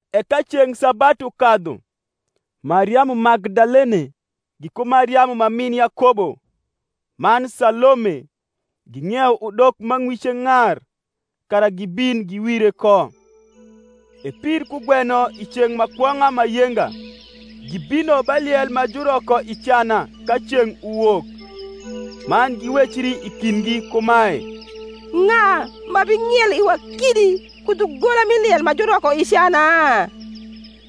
E ka ceng’ sabatu kadhu, Mariamu Magdalene, giku Mariamu ma min Yakobo, man Salome, ging’iewo udok ma ng’wice ng’ar, kara gibin giwire ko. E pir kugweno i ceng’ ma kwong’a ma yenga, gibino ba liel ma juroko i cana ka ceng’ uwok. Man giwecri i kindgi kumae, Ng’a ma bing’ielo iwa kidi ku dhugola mi liel ma juroko i cana?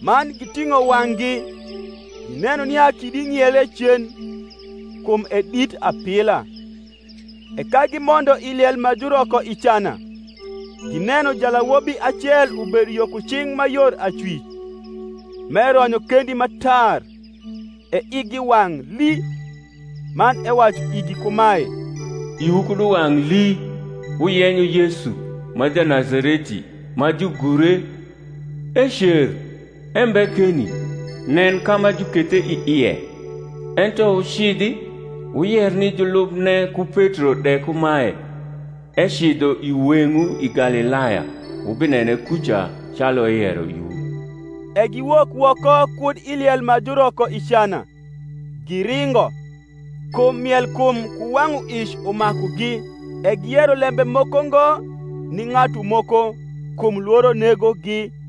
Man giting’o wang’gi, gineno nia kidi ng’iele cen: kum e dit apila. E ka gimondo i liel ma juroko i cana, gineno jalawobi acel ubedo yo ku cing’ ma yor acwic, m’eronyo kendi ma tar; e igi wang’ lii. Man ewacu igi kumae, Iwu kud uwang’ hi; wuyenyo Yesu, ma Janazareti, ma jugure: ecer, embe keni: nen ka ma jukethe i ie! Ento wucidhi, wuyer ni julubne ku Petro de kumae, Ecidho i weng’wu i Galilaya: wubinene kuca, calu eyero iwu. E giwok woko kud i liel ma juroko i cana, giringo: kum mielkum ku wang’uic umakugi: e giyero lembe moko ngo ni ng’atu moko; kum lworo negogi.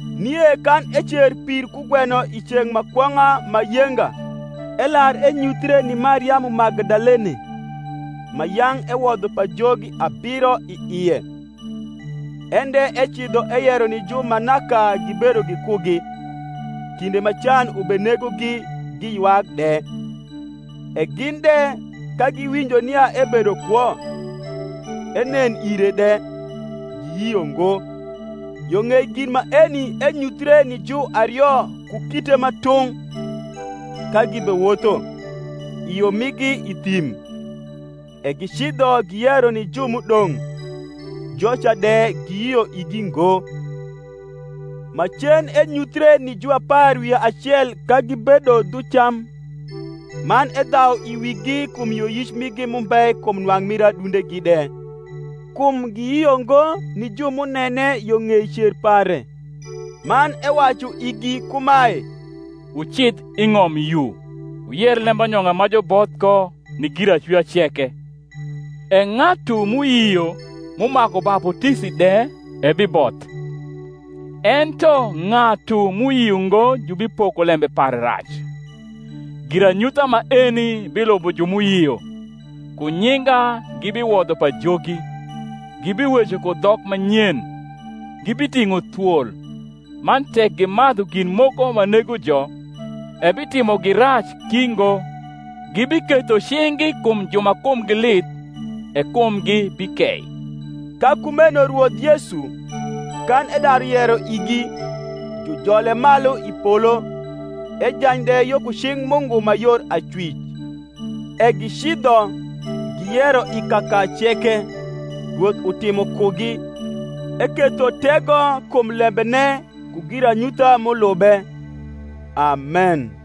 Nie kan ecer pir kugweno i ceng’ ma kwong’a ma yenga elar enyuthre ni Mariamu Magdalene, ma yang’ ewodho pajogi abiro i ie. En de ecidho eyero ni ju ma naka gibedo gikugi, kinde ma can ubenegogi giywak de. E gin de, ka giwinjo nia ebedo kwo, enen ire de, giyio ngo. Yo ng’ei gin maeni enyuthie ni juario ku kite ma tung’, ka gibewotho, i yo migi i thim. E gicidho giyero ni ju m’udong’: joca de giyio igi ngo. Macen enyuthre ni juapar wi acel ka gibedo dhu cam; man edhau i wigi kum yioyic migi m’umbe kum nwang’ mir adundegi de, kum giyio ngo ni ju m’unene yo ng’ei cer pare. Man ewacu igi kumae, Wucidh i ng’om yu, wuyer lembanyong’a ma juboth ko ni giracwia ceke. E ng’atu m’uyio m’umaku baputisi de ebiboth; ento ng’atu m’uyio ngo jubipoko lembe pare rac. Giranyutha maeni bilubo ju m’uyio: ku nyinga gibiwodho pajogi; gibiweco ku dhok ma nyen; gibiting’o thwol, man tek gimadhu gin moko ma negojo, ebitimogi rac ki ngo; gibiketho cing’gi kum ju ma kumgi lith, e kumgi bikei. Ka kumeno Rwoth Yesu, kan edaru yero igi, jujole malu i polo, ejany de yo ku cing’ Mungu ma yor acwic. E gicidho, giyero i kaka ceke, Rwoth utimo kugi, eketho tego kum lembene ku giranyutha m’niube. Amen.